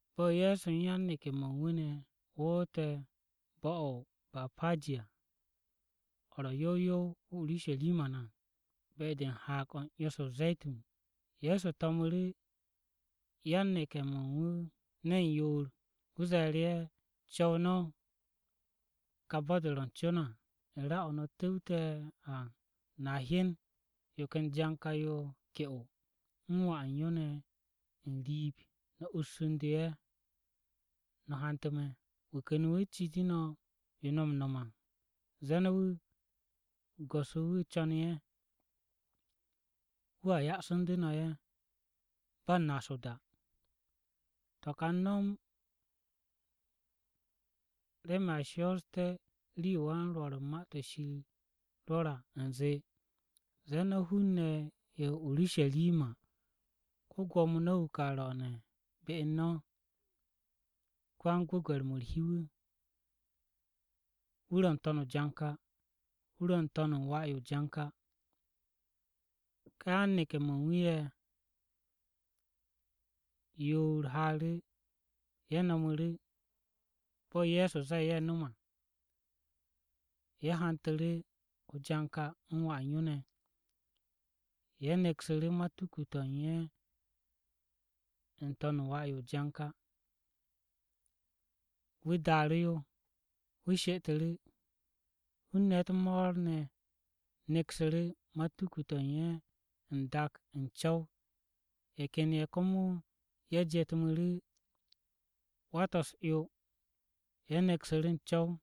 Bo̱ Ye̱so u̱n yan-neke̱-mo̱ u̱n wu̱ ne̱ woote̱ bo̱-o̱ o-Bapaji à, o̱ ro̱ yow yow o-Urusharima ne̱ à, be-de u̱n Haag-o̱ u̱n 'yo-se o-Ze̱tun, Ye̱so to̱mu̱ru̱ yan-neke̱-mo̱ u̱n wu̱ ne̱n yoor. Wu̱ ze̱e̱ru̱ ye̱, “Co̱w no̱ kà bo̱-o̱ ro̱ u̱n co no̱ à. U̱n ra-o̱ no̱ tu̱wte̱ à, no̱a hyen yo ken janka-yo ke'o, u̱n wà u̱n yo ne̱ n-riib. No̱ ussu̱ndu̱ ye̱, no̱ hantu̱ me̱. Wu̱ ken wu̱ citu̱ no̱ yo no̱ m-no̱m à, zee no̱ wu̱, ‘Go̱s-wu̱ wu̱ co̱nu̱ ye̱.’ Wu̱a ya'asu̱ndu̱ no̱ ye̱ ba u̱n naas o-da.” To̱ ka a u̱n no̱m to̱ remen a shoosté̱ rii-yo wan-Rwo̱r u̱n Ma-to̱ Shir rwo̱re̱ à u̱nze, “Ze̱e̱ no̱ hun-ne̱ ye̱ o-Urusharima, Ko-Gwo̱mo no̱ wu̱ ka ro̱o̱ne̱ be u̱n no̱, Ko-yan-gwu̱gwe̱r-mo̱ u̱r-hi wu̱, Wu̱ ro̱ n-to̱n o-janka, wu̱ ro̱ n-to̱n wà-yo o-janka.” Ká yan-neke̱-mo̱ u̱n wu̱ ye̱ yoor haaru̱, ye̱ no̱mu̱ru̱ bo̱ Ye̱so zee ye̱ nom à. Ye̱ hantu̱ru̱ o-janka u̱n wà u̱n yo ne̱. Ye̱ neksu̱ru̱ matuku-to̱ u̱n ye̱ n-to̱n u̱n wà-yo o-janka. Wu̱ daaru̱ yo, wu̱ she'etu̱ru̱. Hun-ne̱ u̱t-mo̱o̱r ne̱ neksu̱ru̱ matuku-to̱ u̱n ye̱ n-dak n-co̱w. Ye̱ ken ye̱ komo ye̱ jetmu̱nu̱ru̱ wa-to̱ u̱s-'yo ye̱ neksu̱ru̱ n-co̱w.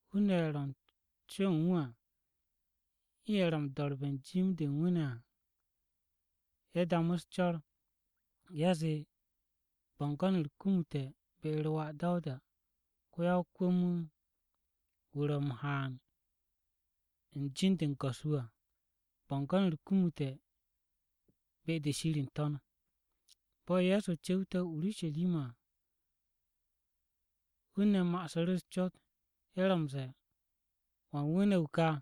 Hun-ne̱ ye̱ ro̱ u̱n co-o̱ u̱n wu̱ à u̱n ye̱ ro̱ m-do̱re̱ u̱n jim-de u̱n wu̱ ne̱ à. Ye̱ damu̱ u̱s-co̱r, ye̱ zee, “Bo̱ngo̱n-u̱r kumute̱ be-u̱r Wà Dawuda! Ko-ya-o-kwu̱m-wu̱, wu̱ ro̱ m-haan u̱n be̱e̱b-de u̱n Yawe à! Bo̱ngo̱n-u̱r kumute̱ be-de Shir n-To̱n!” Bo̱ Ye̱so cu̱wte̱ o-Urusharima à, hun-ne̱ ma'asu̱ru̱ u̱s-cot, ye̱ ro̱ m-ze̱e̱, “¿Wan wu̱ ne̱ wu̱ kà?”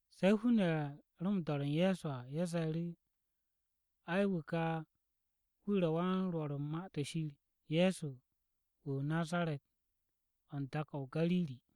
Se̱ hun-ne̱ ye̱ ro̱ m-do̱re̱ u̱n Ye̱so à, ye̱ ze̱e̱ru̱, “Ai, wu̱ ka wu̱ ro̱ wan-rwo̱r u̱n Ma-to̱ Shir, Ye̱so wu̱ o-Nazaret o̱ u̱n dak-o̱ o-Gariri.”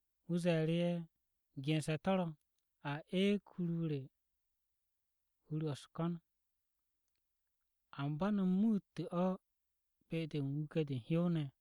Wu̱ ze̱e̱ru̱ ye̱, “Gense̱ to̱ ro̱, ‘A eeg hur-o re hur-o̱ u̱s-ko̱n,’ amba no̱ muute̱ o̱ be-de u̱n wuke̱-de u̱n hyow-ne̱.”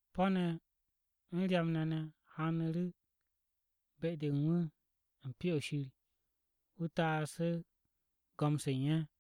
Po̱-ne̱ u̱n ryam-ne̱ ne̱ haanu̱ru̱ be-de u̱n wu̱ u̱n Pyo-o̱ Shir, wu̱ taasu̱ru̱ go̱m-se u̱n ye̱.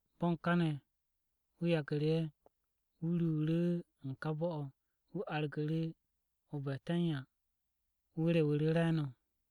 Bo̱n káne̱, wu̱ yagu̱ru̱ ye̱, wu̱ ruuru̱ u̱n ká bo̱-o̱, wu̱ argu̱ru̱ o-Betanya, wu̱ rewu̱ru̱ re̱e̱no̱.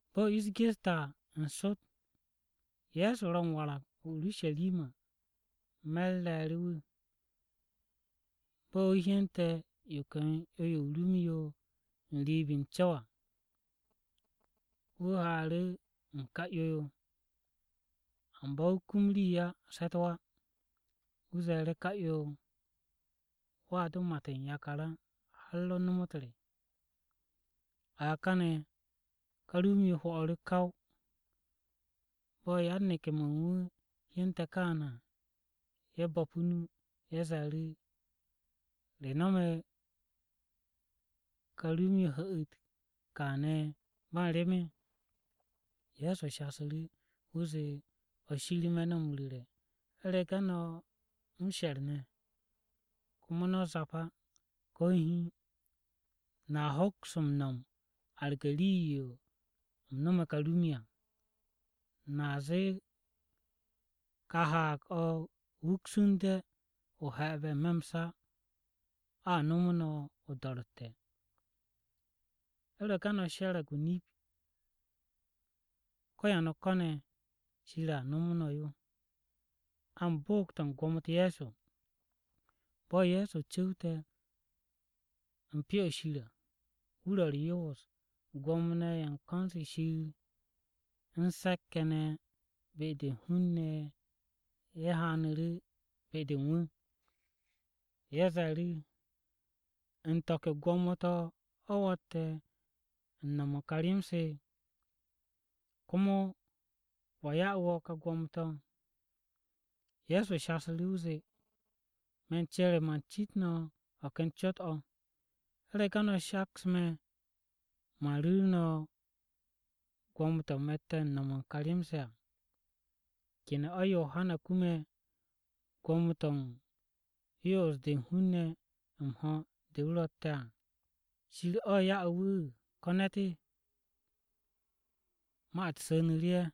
Bo̱ ish geste̱ à, n-sot Ye̱so ro̱ m-warag o-Urusharima me̱r re̱e̱ru̱ wu̱. Bo̱ wu̱ hyente̱ yo ken 'yo-yo o-rum yo n-riib n-co̱w à, wu̱ haaru̱ u̱n ká 'yo-yo. Amba wu̱ kum rii á se̱ u̱t-wa. Wu̱ ze̱e̱ru̱ ká 'yo-yo, “Wo̱a do mat u̱n yakar á har o nomot re!” A kane̱ ká rum-yo hwo̱'u̱ru̱ kaw. Bo̱ yan-neke̱-mo̱ u̱n wu̱ hyente̱ káane̱ à, ye̱ bo̱pu̱ o-nu. Ye̱ ze̱e̱ru̱, “¿Re no̱me̱ ká rum-yo hu̱'u̱te̱ káane̱ ba u̱n rem?” Ye̱so shasu̱ru̱, wu̱ zee, “Nip-o̱ me̱ no̱ m-ru̱re̱, u̱rege̱ no̱ m-she̱r ne̱, komo no̱ zap á, ko̱ hiin, no̱a hoks m-no̱m arge̱ rii-yo u̱m no̱me̱ ká rum-yo à. No̱a zee ka haag-o̱ ‘Wuksu̱nde o he̱'e̱be̱ n-me̱ m-sa.’ O̱a nomo no̱ o-do̱ro̱tte̱. U̱rege̱ no̱ she̱re̱g o-nip ko̱ ya no̱ ko̱ne̱ Shir, no̱a kum yo.” Bo̱ Ye̱so cu̱wte̱ u̱n Pyo-o̱ Shir à, wu̱ ro̱ u̱r-yoos, Gwo̱mo-ne̱ ye̱ u̱n ko̱n-se Shir u̱n se̱k-ye̱ ne̱ be-de u̱n hun-ne̱ ye̱ haanu̱ru̱ be-de u̱n wu̱. Ye̱ ze̱e̱ru̱, “¿U̱n to̱ ke gwo̱mo-to̱ o̱ wo̱tte̱ u̱n no̱m u̱n ká rem-se? ¿Komo wa ya'u̱ wo̱ kà gwo̱mo-to̱?” Ye̱so shasu̱ru̱, wu̱ zee, “Me̱ u̱n cere, man cit no̱ o̱ ken cot-o̱. U̱rege̱ no̱ shaks me̱, man ru̱ru̱ no̱ gwo̱mo-to̱ me̱tte̱ u̱n no̱m u̱n ká rem-se à. ¿Kene̱ Yohana kume̱ gwo̱mo-to̱ u̱n yo'os-de u̱n hun-ne̱ m-ho̱ de wu̱ no̱me̱ à? ¿Shir o̱ ya'e̱ wu̱ ko̱ ne̱t?” Ma-u̱t su̱nu̱ru̱ ye̱,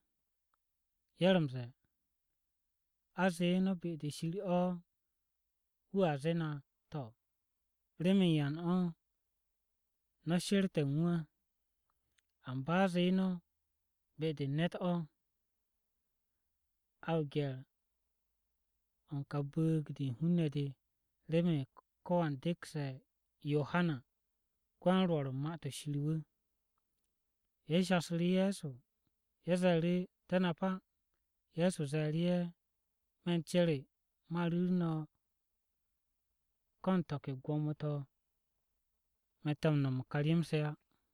ye̱ ro̱ m-ze̱e̱, “A zee no̱ be-de Shir o̱, wu̱a zee na, ‘To̱, ¿remen yan o̱ a she̱rte̱ u̱n wu̱ á?’ Amba a zee no̱, ‘Be-de u̱n ne̱t o̱,’ A o-gye̱r u̱n ka bu̱u̱g-de u̱n hun-ne̱ de, remen ko̱wan dekse̱ Yohana ko-yan-Rwo̱r u̱n Ma-to̱ Shir wu̱.” Ye̱ shasu̱ru̱ Ye̱so, ye̱ ze̱e̱ru̱, “Te̱ nap á.” Ye̱so ze̱e̱ru̱ ye̱, “Me̱ u̱n cere man ru̱ru̱ no̱ ko̱ u̱n to̱ ke gwo̱mo-to̱ me̱tte̱ m-no̱m u̱n ká rem-se á.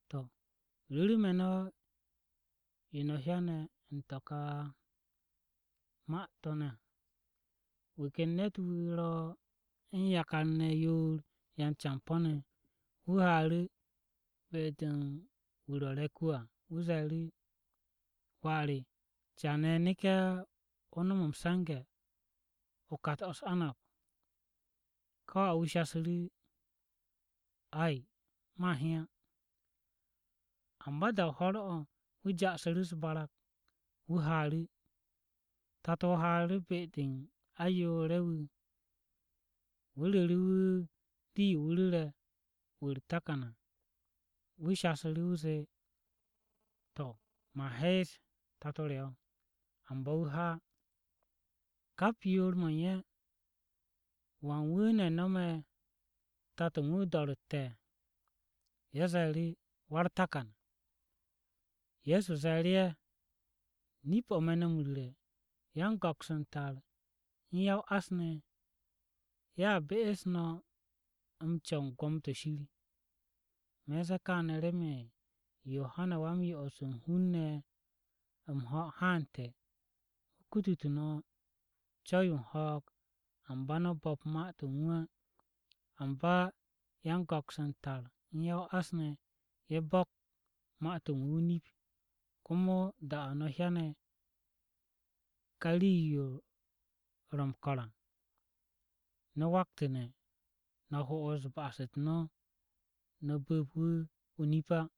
“To̱, ru̱ru̱ me̱ no̱ yo no̱ hyane̱ u̱n to̱ ka ma-to̱ ne̱ à. Wu̱ ken ne̱t-wu̱ ro u̱n yakar-ne̱ yoor yan-campo̱-ne̱. Wu̱ haaru̱ be-de u̱n wu̱ ro̱ se̱k-wu̱ à, wu̱ ze̱e̱ru̱, ‘Wà re, caane̱ neke̱, o nom m-se̱nge̱ o-kat o̱ u̱s-anab.’ “Ká wà-wu̱ shasu̱ru̱, ‘Ay, man he á.’ Amba da-o ho̱r-o̱, wu̱ ja'asu̱ru̱ u̱s-barag, wu̱ haaru̱. “Tato-o haaru̱ be-de u̱n ayoore̱-ye̱ wu̱, wu̱ ru̱ru̱ wu̱ rii-yo wu̱ ru̱re̱ wu̱ u̱r-takan à. Wà shasu̱ru̱, wu̱ zee, ‘To̱, man hees, Tato re o̱.’ Amba wu̱ ha á. “Kap yoor-mo̱ u̱n ye̱, ¿wan wu̱ ne̱ nome̱ tato u̱n wu̱ o-do̱ro̱tte̱?” Ye̱ ze̱e̱ru̱, “Wà u̱r-takan.” Ye̱so ze̱e̱ru̱ ye̱, “Nip-o̱ me̱ no̱ m-ru̱re̱, yan-go̱ks u̱n tar u̱n ya-o-ás ne̱, ye̱a be'es no̱ co̱w u̱n gwo̱mo-to̱ Shir. Me̱ u̱n ze̱e̱ kaane̱ remen Yohana Wa-m-Yo'os u̱n hun-ne̱ m-ho̱ haante̱ wu̱ kutute̱ no̱ co̱w-yo u̱n ho̱o̱g, amba no̱ bo̱p ma-to̱ u̱n wu̱ á. Amba yan-go̱ks u̱n tar u̱n ya-o-ás, ye̱ bo̱k ma-to̱ u̱n wu̱ o-nip. Komo da-o̱ no̱ hyane̱ ka rii-yo ro̱ m-ko̱r à no̱ waktu̱ne̱ no̱ ho'os ba'as-u̱t no̱, no̱ bu̱p wu̱ o-nip á.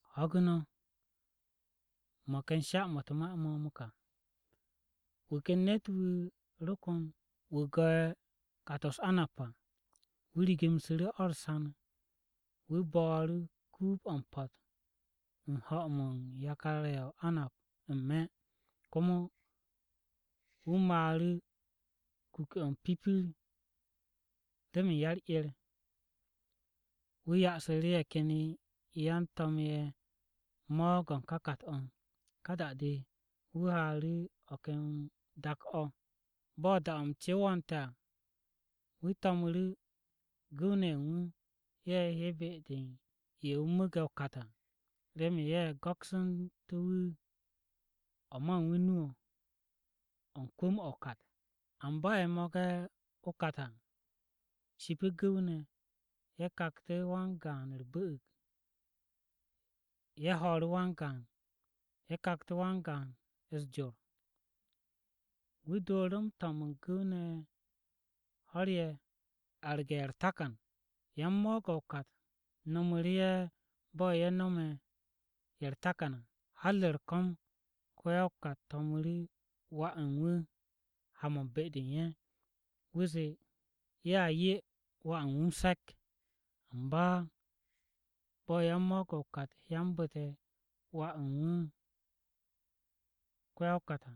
“Ho̱gu̱ no̱, mo̱ ken sha-mo̱ u̱t-ma mo̱ komo. Wu̱ ken ne̱t-wu̱ ro kon wu̱ go̱'e̱ kat-o̱ u̱s-anab à. Wu̱ rigimshiru̱ o̱ u̱r-san, wu̱ bo̱o̱ru̱ kuub-o̱ m-po̱t u̱n ho̱-mo̱ u̱n yakar-ye̱ u̱n anab n-me̱. Komo wu̱ maaru̱ kuke̱-o m-pipir remen ya-u̱r-'er. Wu̱ ya'asu̱ru̱ ye̱ ken yan-to̱m-ye̱ mo̱o̱g-o̱ u̱n ká kàt-o̱, ka da-de, wu̱ haaru̱ o̱ ken dak-o̱. Bo̱ da-o̱ m-ce wo̱o̱nte̱ à, wu̱ to̱mnu̱ru̱ gu̱w-ne̱ ye̱ u̱n wu̱. Ye̱ he be-de u̱n ye̱ wu̱ mu̱u̱ge̱ o-kat à, remen ye̱ go̱ksu̱ntú̱ wu̱ o̱ ma u̱n wu̱ nu-o̱, o̱ u̱n kwu̱m-o̱ o-kat. “Amba ye̱ mo̱ge̱ o-kat à shipi gu̱w-ne̱, ye̱ kaktu̱ wan-gaan u̱r-bu̱'u̱g, ye̱ ho̱o̱ru̱ wan-gaan, ye̱ kaktu̱ wan-gaan u̱s-jor. Wu̱ dooru̱ m-to̱m u̱n gu̱w-ne̱ ho̱r-ye̱ arge̱ ye̱ u̱r-takan. Yan-mo̱o̱g-o̱ o-kat nomu̱ru̱ ye̱ bo̱ ye̱ nome̱ ye̱ u̱r-takan à. Har u̱r-ko̱m, ko-ya-o-kat to̱mu̱ru̱ wà u̱n wu̱ ha-mo̱ u̱n be-de u̱n ye̱. Wu̱ zee, ‘Ye̱a 'ye wà re m-se̱k.’ “Amba bo̱ yan-mo̱o̱g o-kat hyanbu̱te̱ wà-wu̱ u̱n ko-ya-o-kat à,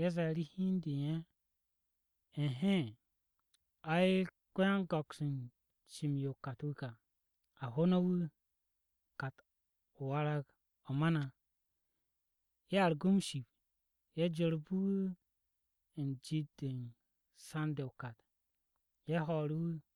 ye̱ ze̱e̱ru̱ hi u̱n de u̱n ye̱, ‘Ehee! Ai, ko-yan-go̱ks u̱n cim-yo o-kat wu̱ ka. A ho no̱ wu̱, kat-o warag o̱ ma na!’ Ye̱ argu̱ wu̱ m-ship, ye̱ jorbu̱ wu̱ u̱n jit-de san-de o-kat. Ye̱ ho̱o̱ru̱ wu̱.”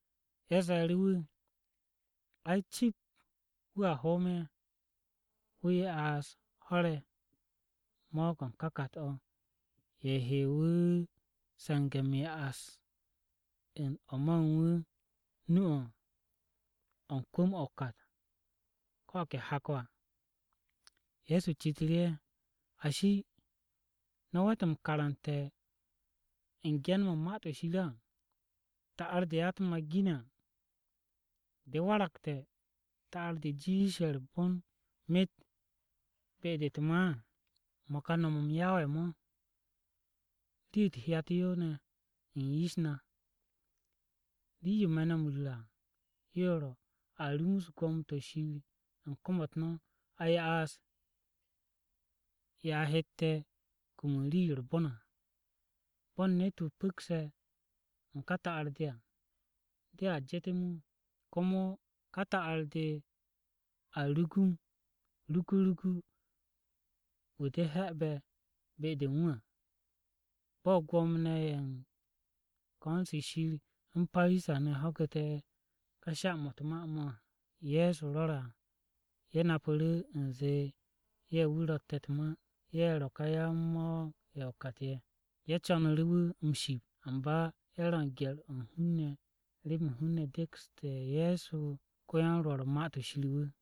Ye̱ ze̱e̱ru̱ wu̱, “Ai, cip wu̱a hoom ye̱, wu̱ ya'as ho̱r-ye̱ mo̱o̱g-o̱ u̱n ká kat-o̱, ye̱ he wu̱ se̱nge̱ m-ya'as u̱n o̱ ma u̱n wu̱ nu-o̱, o̱ u̱n kwu̱m-o̱ o-kat ko̱ o̱ ke hak-o̱.” Ye̱so citu̱ru̱ ye̱, “Ashi, ¿no̱ we̱t m-karante̱ u̱n ge̱n-mo̱ u̱n Ma-to̱ Shir á? “ ‘Ta'ar-de ya-u̱t-ma ginme̱ à, de waragte̱ ta'ar-de jiishe̱ u̱r-bon myet be-de u̱t-ma à. Mo̱ ka no̱m-m Yawe mo̱, rii-yo u̱t-hyat yo ne̱ u̱n yish na.’ “Rii-yo me̱ no̱ m-ru̱re̱ à yo ro̱ a rumus gwo̱mo-to̱ Shir u̱n kom-u̱t no̱, a ya'as ye̱ a hette̱ kum u̱n rii-yo u̱r-bon à. Bo̱n ne̱t-wu̱ pu̱kse̱ u̱n ká ta'ar-de à, dea jetem wu̱. Komo ká ta'ar-de a rugum re̱e̱w wu̱ de he̱'e̱be̱ be-de u̱n wu̱ à.” Bo̱ Gwo̱mo-ne̱ ye̱ u̱n ko̱n-se Shir u̱n Parisa-ne̱ ho̱gu̱te̱ ká sha-mo̱ u̱t-ma mo̱ Ye̱so rwo̱re̱ à, ye̱ napu̱ru̱ u̱nze ye̱ wu̱ ro̱tte̱ u̱t-ma. Ye̱ ro̱ ká yan-mo̱o̱g-o̱ o-kat ye̱. Ye̱ co̱nu̱ru̱ wu̱ m-ship, amba ye̱ ro̱ u̱n gye̱r-o̱ u̱n hun-ne̱ remen hun-ne̱ dekstu̱ Ye̱so ko-yan-Rwo̱r u̱n Ma-to̱ Shir wu̱.